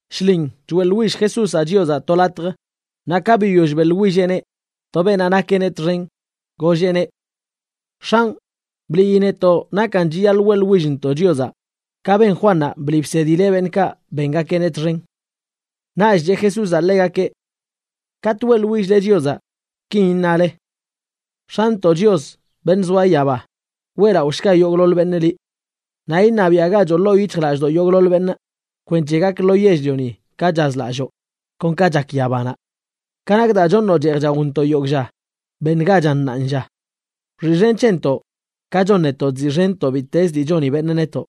Shlin choeꞌḻwill Jesúzaꞌ Chiozaꞌ to latj, naꞌ ka biyoll beꞌḻwilleꞌneꞌ, to beenaꞌ nakeꞌneꞌ txen golleꞌneꞌ: ―X̱anꞌ, bliꞌyi netoꞌ nakan chiyaḻꞌ weꞌḻwillntoꞌ Chiozaꞌ, ka ben Juannaꞌ bliꞌ bsedileꞌ beṉꞌkaꞌ bengakeꞌneꞌ txen. Naꞌch cheꞌ Jesúzaꞌ ḻegakeꞌ: ―Katꞌ weꞌḻwill-le Chiozaꞌ kin iṉale: X̱antoꞌ Chios, beṉꞌ zoa yaba, weꞌlaꞌoshga yogꞌḻoḻ beṉꞌ liꞌ. Naꞌ iṉabiaꞌgachoꞌ ḻoo yic̱hjlallꞌdoꞌ yogꞌḻoḻ beṉꞌ kwenc̱he gak lo yell-lioni ka chazlalloo, kon ka chak yabanaꞌ. Ka nak daa choṉoꞌ cheej chaontoꞌ yogꞌ lla, beṉgachan ṉaanlla. Wxiꞌxen c̱hentoꞌ, ka chon netoꞌ chziꞌxenntoꞌ bittezə dii choni beṉꞌ netoꞌ.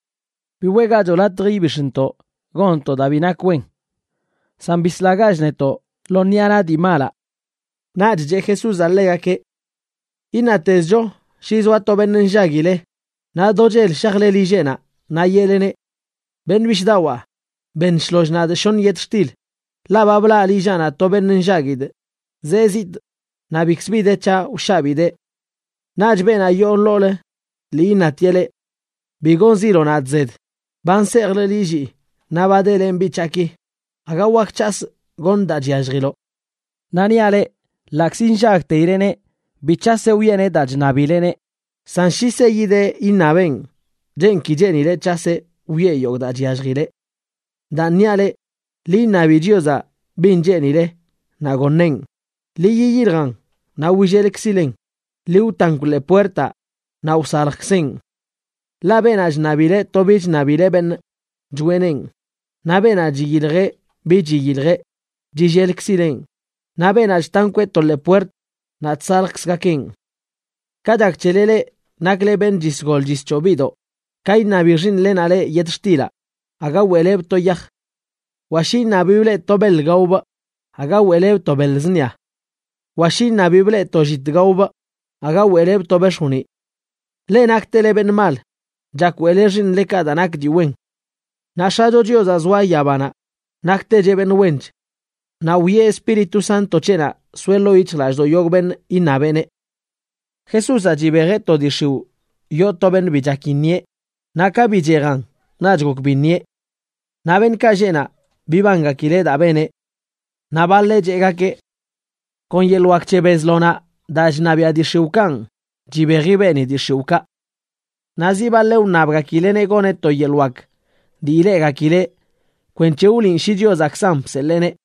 Bi weꞌgachoꞌ latj ibix̱ntoꞌ gonntoꞌ daa bi nak wen, san bislagach netoꞌ lo ṉiꞌa naꞌ dii malaꞌ. Naꞌch cheꞌ Jesúzaꞌ ḻegakeꞌ: ―Iṉatezcho shi zoa to beṉꞌ nllaguile naꞌ do chel shajle lilleꞌnaꞌ naꞌ yeꞌleneꞌ: “Beṉꞌ bishꞌdawaa, beṉ shloll nadꞌ shoṉ yetxtil, ḻaꞌ ba blaꞌ lillaꞌnaꞌ to beṉꞌ nllaguidꞌ, zee zitꞌ, naꞌ bikzə bi de c̱haꞌ wshabidee.” Naꞌch beenaꞌ yoo ḻoolə lii iṉatieꞌ leꞌ: “Bi gonziloꞌ nadꞌ zed, ba nsejlꞌ lillii naꞌ ba delenꞌ biꞌ c̱haꞌki. Aga wak c̱hasꞌ goṉꞌ daa chyalljiloꞌ.” Naꞌ niaꞌ leꞌ, ḻaꞌkzi nllagteileꞌneꞌ, bi c̱haseꞌ wiꞌeneꞌ daa chṉabileꞌneꞌ. San shi seyideꞌ iṉabeꞌn, chen ki cheenileꞌ c̱haseꞌ wiꞌe yogꞌ daa chyalljile. Daan niaꞌ leꞌ: Ḻi iṉabi Chiozaꞌ bin cheenile naꞌ goṉeꞌn. Ḻi yiyiljan naꞌ willelkzilen. Ḻi wtankw ḻee puertaꞌ, naꞌ wsaljkzeꞌn. Ḻaꞌ beenaꞌ chṉabileꞌ to bi chṉabileꞌ beṉꞌ, choꞌeneꞌn; naꞌ beenaꞌ chiyiljeꞌ bi chiyiljeꞌ, chillelkzileꞌn; naꞌ beenaꞌ chtankweꞌ to ḻee puert, naꞌ chsaljkzgakeꞌn. ’Ka chak c̱hele leꞌ nakle beṉꞌ chisgol chischoo biꞌdoꞌ, ka iṉabi xiiṉlenaꞌ leꞌ yetxtilaꞌ, aga weꞌlebꞌ to yaj. Wa shi iṉabibꞌ leꞌ to beḻ gaobꞌ, aga weꞌlebꞌ to beḻ zṉia. Wa shi iṉabibꞌ leꞌ to llit gaobꞌ, aga weꞌlebꞌ to bex̱joniꞌ. Leꞌ naktele beṉꞌ mal, chak weꞌle xiiṉlekaꞌ daa nak dii wen. ¡Naꞌ X̱acho Chiozaꞌ zoa yabanaꞌ naktecheꞌ beṉꞌ wench! Naꞌ wiꞌe Espíritu Santo c̱heꞌnaꞌ soeꞌ ḻoo yic̱hjlallꞌdoꞌ yogꞌ beṉꞌ iṉabeꞌneꞌ. Jesúzaꞌ chibejeꞌ to dii x̱iwꞌ yoo to beṉꞌ bi chak iṉieꞌ, naꞌ ka bichejan naꞌch gok biṉieꞌ. Naꞌ beṉꞌkaꞌ lleꞌ naꞌ, bibangakileꞌ daa beneꞌ. Naꞌ baḻeꞌ cheꞌgakeꞌ: ―Kon yeḻꞌ wak c̱he Bezlonaꞌ, daa chṉabiaꞌ dii x̱iwꞌkanꞌ, chibeji beeni dii x̱iwꞌkaꞌ. Naꞌ zi baḻeꞌ wṉabgakileꞌneꞌ goneꞌ to yeḻꞌ wak dii ileꞌgakileꞌ kwenc̱he wliꞌn shi Chiozaꞌkzan bseḻeeneꞌ.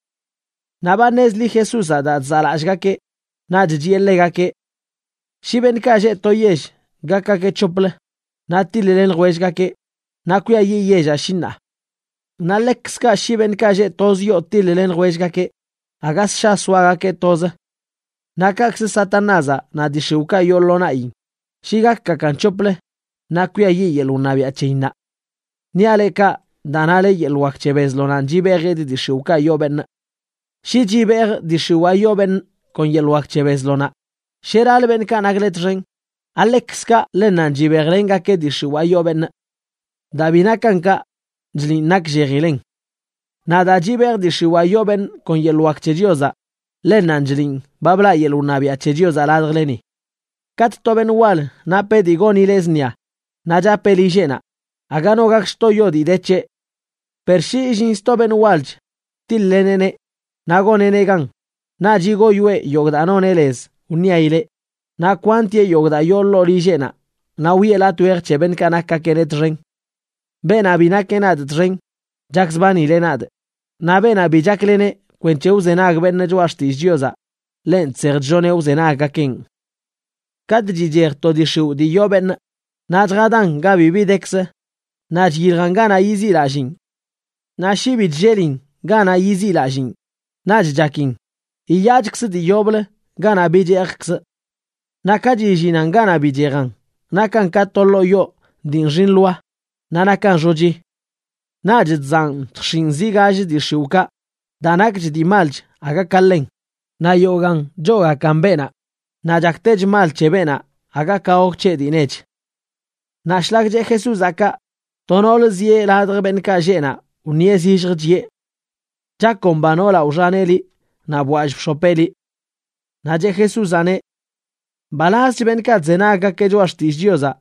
Naꞌ ba ṉezli Jesúzaꞌ daa chzaꞌlallꞌgakeꞌ, naꞌch chiꞌe ḻegakeꞌ: ―Shi beṉꞌkaꞌ lleꞌ to yell gakgakeꞌ c̱hoplə naꞌ tiḻ-len ljwellgakeꞌ, naꞌ kwiayiꞌ yellaꞌ, shi ṉaa. Naꞌ ḻekzkaꞌ shi beṉꞌkaꞌ lleꞌ toz yoo tiḻ-len ljwellgakeꞌ, aga ssha soagakeꞌ toz. Naꞌ kaꞌkzə Satanázaꞌ naꞌ dii x̱iwꞌkaꞌ yoo lo naꞌyin, shi gakgakan c̱hoplə naꞌ kwiayiꞌ yeḻꞌ wṉabiaꞌ c̱heyinnaꞌ. Niaꞌ leꞌ kaꞌ daa nale yeḻꞌ wak c̱he Bezlonana chibejidꞌ dii x̱iwꞌkaꞌ yoo beṉꞌ. Shi chibejꞌ dii x̱iwaa yoo beṉꞌ kon yeḻꞌ wak c̱he Bezlonaꞌ,b ¿sheralə beṉꞌkaꞌ nakle txen? ¿Aḻekzkaꞌ ḻennanꞌ chibejlengakeꞌ dii x̱iwaa yoo beṉꞌ? Daa bi nakan kaꞌ, chliꞌn nakllejilen. Naꞌ daa chibejꞌ dii x̱iwaa yoo beṉꞌ kon yeḻꞌ wak c̱he Chiozaꞌ, ḻennanꞌ chliꞌn ba blaꞌ yeḻꞌ wṉabiaꞌ c̱he Chiozaꞌ ladjleni. ’Katꞌ to beṉꞌ wal napeꞌ dii gonileꞌ zṉia naꞌ chapeꞌ lilleꞌnaꞌ, aga no gak lljtoyo dii de c̱heꞌ. Per shi illin sto beṉꞌ walch tiḻ-leneꞌneꞌ, naꞌ goneꞌneꞌ gan, naꞌch yigoyoeꞌ yogꞌ daa noneꞌ lez wṉiaileꞌ, naꞌ kwantieꞌ yogꞌ daa yoo ḻoo lilleꞌnaꞌ naꞌ wiꞌe latꞌ wej c̱he beṉꞌkaꞌ nakgakeꞌneꞌ txen. ’Beenaꞌ bi nakeꞌ nadꞌ txen, chakzbanileꞌ nadꞌ. Naꞌ beenaꞌ bi chaklen kwenc̱he wzenag beṉꞌ choꞌa xtillꞌ Chiozaꞌ, ḻenꞌ chsej chlloneꞌ wzenaggakeꞌn. ’Katꞌ chichej to dii x̱iwꞌ dii yoo beṉꞌ, naꞌ chjadan ga bibi dekzə naꞌ chyiljan ganaꞌ yiziꞌlalliin. Naꞌ shi bi chllelin ganaꞌ yiziꞌlalliin naꞌch chakin: “Yiyaachkzꞌ dii yoblə ganaꞌ bichejkzꞌ.” Naꞌ ka chillinan ganaꞌ bichejan, nakan ka to ḻoo yoo dii nxi nḻoa naꞌ nakan xochi. Naꞌch chzaꞌn chjx̱iꞌn zi gall dii x̱iwꞌkaꞌ daa nakch dii malch aga ka ḻen, naꞌ yogaan choogakan beenaꞌ. Naꞌ chaktechlə mal c̱he beenaꞌ aga ka gok c̱heꞌ dii nech. Naꞌ shlak cheꞌ Jesúzaꞌ kaꞌ, to noolə zieꞌ ladj beṉꞌkaꞌ lleꞌ naꞌ wṉieꞌ zilljə, chiꞌe: ―¡Chakomba noolaꞌ wxaneꞌ liꞌ naꞌ bwall bx̱opeꞌ liꞌ! Naꞌ cheꞌ Jesúzaꞌneꞌ: ―¡Mbalazch beṉꞌkaꞌ chzenaggakeꞌ choꞌa xtillꞌ Chiozaꞌ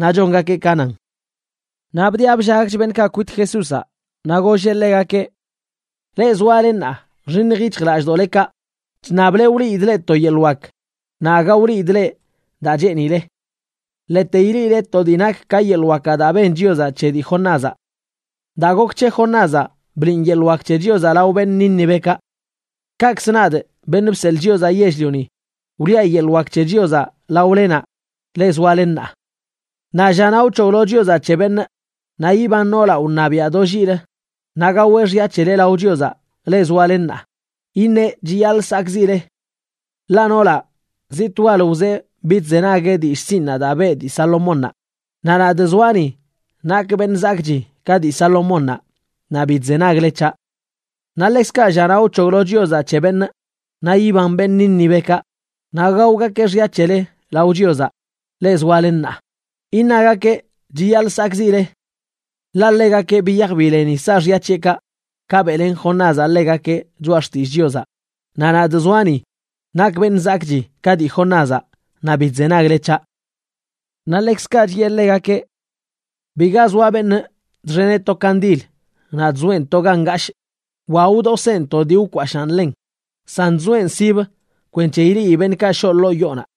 naꞌ chongakeꞌ ka nan! Naꞌ bdiꞌa bllagch beṉꞌkaꞌ kwit Jesúzaꞌ naꞌ golleꞌ ḻegakeꞌ: ―Leꞌ zoale ṉaa, nxiṉj yic̱hjlallꞌdoꞌlekaꞌ. Chṉable wliidꞌ leꞌ to yeḻꞌ wak, naꞌ aga wliidꞌ leꞌ daa cheenile. Ḻete ileꞌile to dii nak ka yeḻꞌ wakaꞌ daa ben Chiozaꞌ c̱he dii Jonázaꞌ. Daa gok c̱he Jonázaꞌ bliꞌn yeḻꞌ wak c̱he Chiozaꞌ lao beṉꞌ Nínivekaꞌ. Kakzə nadꞌ, Beṉꞌ Bseḻꞌ Chiozaꞌ Yell-lioni, wliꞌa yeḻꞌ wak c̱he Chiozaꞌ laolenaꞌ, leꞌ zoale ṉaa. Naꞌ llanaꞌ wc̱hoglo Chiozaꞌ c̱he beṉꞌ, naꞌ yiban noolaꞌ wṉabiaꞌ do lliꞌlə, naꞌ gaweꞌ xya c̱hele lao Chiozaꞌ, leꞌ zoale ṉaa, iṉeꞌ chiyaḻꞌ sakꞌziꞌle. Ḻaꞌ noolaꞌ, zitꞌ wal wzee bidzenagueꞌ dillꞌ sinꞌnaꞌ daa beꞌ dii Salomónnaꞌ, naꞌ nadꞌ zoaꞌ ni, nakꞌ beṉꞌ zakꞌchi ka dii Salomónnaꞌ, naꞌ bi chzenagle c̱haꞌ. Naꞌ ḻekzkaꞌ llanaꞌ wc̱hoglo Chiozaꞌ c̱he beṉꞌ, naꞌ yiban beṉꞌ Nínivekaꞌ naꞌ gaogakeꞌ xya c̱hele lao Chiozaꞌ, leꞌ zoale ṉaa, iṉagakeꞌ chiyaḻꞌ sakꞌziꞌle. Ḻaꞌ ḻegakeꞌ biyaj bileni saaxya c̱heꞌkaꞌ ka beꞌlen Jonázaꞌ ḻegakeꞌ choꞌa xtillꞌ Chiozaꞌ, naꞌ nadꞌ zoaꞌ ni, nakꞌ beṉꞌ zakꞌchi ka dii Jonázaꞌ, naꞌ bi chzenagle c̱haꞌ. Naꞌ ḻekzkaꞌ chiꞌe ḻegakeꞌ: ―Biga zoa beṉꞌ chxeneꞌ to kandil naꞌ chzoeꞌn to ga ngashꞌ wa wdoseen to dii wkwashaan ḻen, san chzoeꞌn sibə kwenc̱he ileꞌi beṉꞌkaꞌ shoꞌ ḻoo yoonaꞌ.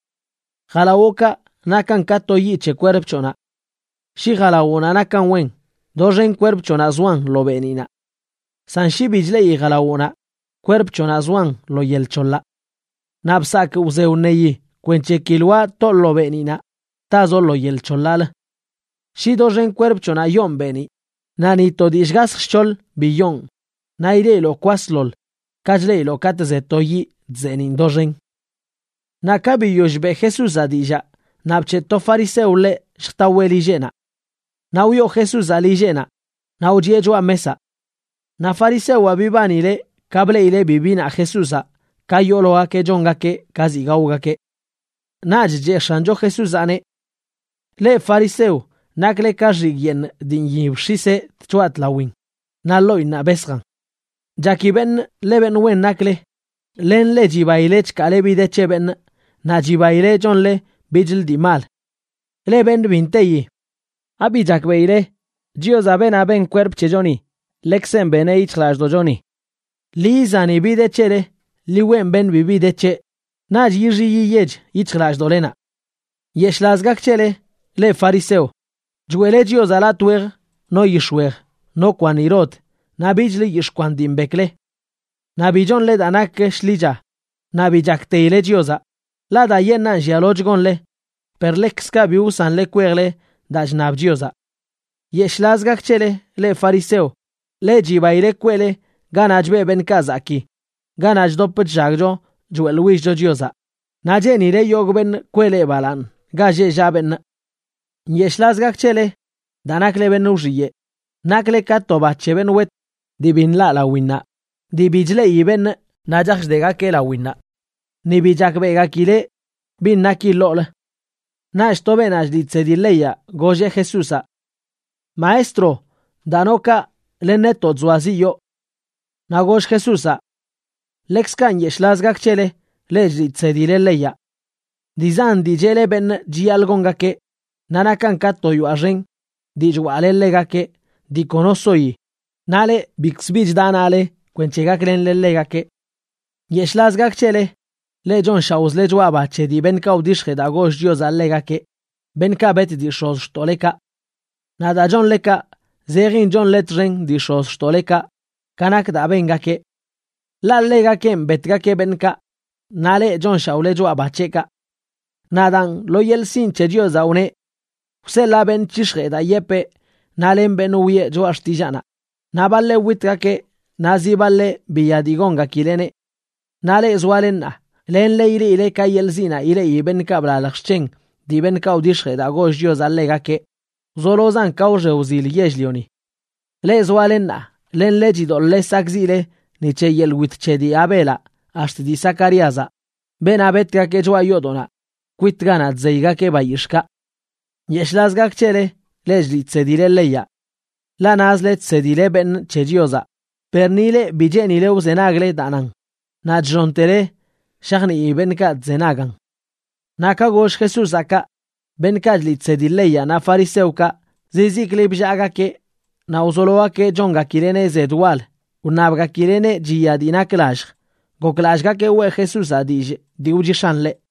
Jalawoꞌkaꞌ nakan ka to yiꞌ c̱he kwerp c̱hoꞌnaꞌ. Shi jalawoꞌnaꞌ nakan wen, doxen kwerp c̱hoꞌnaꞌ zoan lo beeniꞌnaꞌ. San shi bi chleꞌi jalawoꞌnaꞌ, kwerp c̱hoꞌnaꞌ zoan lo yel c̱holaꞌ. Naꞌ bsakꞌ wze wṉeyi kwenc̱he ki lwaa toꞌ lo beeniꞌnaꞌ, tazoꞌ lo yel c̱hoḻaꞌlə. Shi doxen kwerp c̱hoꞌnaꞌ yoon beeniꞌ, naꞌ ni to dii shgasj shc̱hoḻ bi yoon, naꞌ ileꞌiloꞌ kwasḻoḻ ka chleꞌiloꞌ katꞌ ze to yiꞌ chzeeniꞌn doxen. Naꞌ ka biyoll beꞌ Jesúzaꞌ dillaa, naꞌ bc̱heꞌ to fariseo ḻeꞌ lljtaweꞌ lilleꞌnaꞌ. Naꞌ wyoo Jesúzaꞌ lilleꞌnaꞌ naꞌ wchiꞌe choꞌa mesaꞌ. Naꞌ farisewaꞌ bibanileꞌ ka bleꞌileꞌ bi binaꞌ Jesúzaꞌ ka yoologakeꞌ chongakeꞌ ka ziꞌ gaogakeꞌ. Naꞌch cheꞌ X̱ancho Jesúzaꞌneꞌ: ―Leꞌ fariseo nakle ka xigꞌ yeeṉ dii nyib x̱iseꞌ tchoꞌa tlawin naꞌ ḻoꞌinnaꞌ besjan. Chaki beṉꞌ ḻe beṉꞌ wen nakle, len leꞌ chibaile chkaale bi de c̱he beṉꞌ naꞌ chibaile chonle bichlə dii mal. ¡Leꞌ beṉꞌ bi nteyi! ¿Abi chakbeꞌile Chiozaꞌ, beenaꞌ ben kwerp c̱hechoni, ḻekzeꞌn beneꞌ yic̱hjlallꞌdoꞌchoni? Ḻi izani bi de c̱hele, ḻi weꞌn beṉꞌ bibi de c̱heꞌ, naꞌch yixiꞌ yiyech yic̱hjlallꞌdoꞌlenaꞌ. ’¡Nyeshꞌlaz gak c̱hele, leꞌ fariseo! Choeꞌle Chiozaꞌ latꞌ wejc no yix̱wej, no kwanirod naꞌ bichlə yix̱ꞌ kwan dii mbekle. Naꞌ bi chonle daa nak shḻicha naꞌ bi chakteileꞌ Chiozaꞌ. Ḻaꞌ daayeṉꞌan llialoch gonle per ḻekzkaꞌ bi wsanle kwejle daa chṉab Chiozaꞌ. ’¡Nyeshꞌlaz gak c̱hele, leꞌ fariseo! Ḻe chibaile kweꞌle ganaꞌ chbeꞌ beṉꞌkaꞌ zakii ganaꞌ chdop chllagcho choeꞌḻwillcho Chiozaꞌ, naꞌ cheenile yogꞌ beṉꞌ kwee leꞌ balaaṉ ga lleꞌ llaꞌ beṉꞌ. ’¡Nyeshꞌlaz gak c̱hele, daa nakle beṉꞌ wxiyeꞌ! Nakle ka to ba c̱he beṉꞌ wet dii bi nlaꞌ lawinnaꞌ dii bi chleꞌi beṉꞌ naꞌ chaj chdegakeꞌ lawinnaꞌ, ni bi chakbeꞌgakileꞌ bin naki ḻoolə. Naꞌch to beenaꞌ chliꞌ chsedi leyaꞌ golleꞌ Jesúzaꞌ: ―Maestro, daa noꞌ kaꞌ len netoꞌ chzoaziꞌyoo. Naꞌ goll Jesúzaꞌ: ―¡Ḻekzkaꞌ nyeshꞌlaz gak c̱hele, leꞌ chliꞌ chsedile leyaꞌ! Dii zan dii cheꞌle beṉꞌ chiyaḻꞌ gongakeꞌ, naꞌ nakan ka to yoaꞌ xen dii chwaꞌle ḻegakeꞌ dii kono soyi, naꞌ leꞌ bikz bi chda naꞌle kwenc̱he gaklenle ḻegakeꞌ. ’¡Nyeshꞌlaz gak c̱hele! Leꞌ chonshaoꞌzle choꞌa ba c̱he dii beṉꞌkaꞌ wdix̱jee daa goll Chiozaꞌ ḻegakeꞌ, beṉꞌkaꞌ bet dii x̱ozxtoꞌlekaꞌ. Naꞌ daa chonle kaꞌ zejin chonle txen dii x̱ozxtoꞌlekaꞌ ka nak daa bengakeꞌ. Ḻaꞌ ḻegakenꞌ betgakeꞌ beṉꞌkaꞌ, naꞌ leꞌ chonshaoꞌle choꞌa ba c̱heꞌkaꞌ. ’Naꞌ daan, lo yeḻꞌ sinꞌ c̱he Chiozaꞌ wneꞌ: “Wseḻaa beṉꞌ c̱hix̱jee daa yepee naꞌ len beṉꞌ wiꞌe choꞌa xtillaanaꞌ, naꞌ baḻeꞌ witgakeꞌ naꞌ zi baḻeꞌ biya dii gongakileꞌneꞌ.” Naꞌ leꞌ zoale ṉaa, lenle ileꞌile ka yeḻꞌ ziꞌnaꞌ ileꞌi beṉꞌkaꞌ blalj xc̱hen dii beṉꞌkaꞌ wdix̱jee daa goll Chiozaꞌ ḻegakeꞌ, wzolozan ka wxe wzil yell-lioni. Leꞌ zoale ṉaa, lenle chidoḻꞌle sakꞌziꞌle ni c̱he yeḻꞌ wit c̱he dii Abelaꞌ ax̱t dii Zacaríazaꞌ, beenaꞌ betgakeꞌ choꞌa yoodoꞌnaꞌ kwit ganaꞌ chzeygakeꞌ bayix̱ꞌkaꞌ. ’¡Nyeshꞌlaz gak c̱hele, leꞌ chliꞌ chsedile leyaꞌ! Ḻaꞌ nazle chsedile beṉꞌ c̱he Chiozaꞌ, per ni leꞌ bi cheenile wzenagle daa nan, naꞌ chllontele shajnii beṉꞌkaꞌ chzenagan. Naꞌ ka goll Jesúzaꞌ kaꞌ, beṉꞌkaꞌ chliꞌ chsedi leyaꞌ naꞌ fariseokaꞌ zizikli bllaagakeꞌ naꞌ wzologakeꞌ chongakileꞌneꞌ zed wal wṉabgakileꞌneꞌ chiya dii nak lallj, goklallꞌgakeꞌ weꞌ Jesúzaꞌ dillꞌ dii wchix̱aꞌn ḻeꞌ.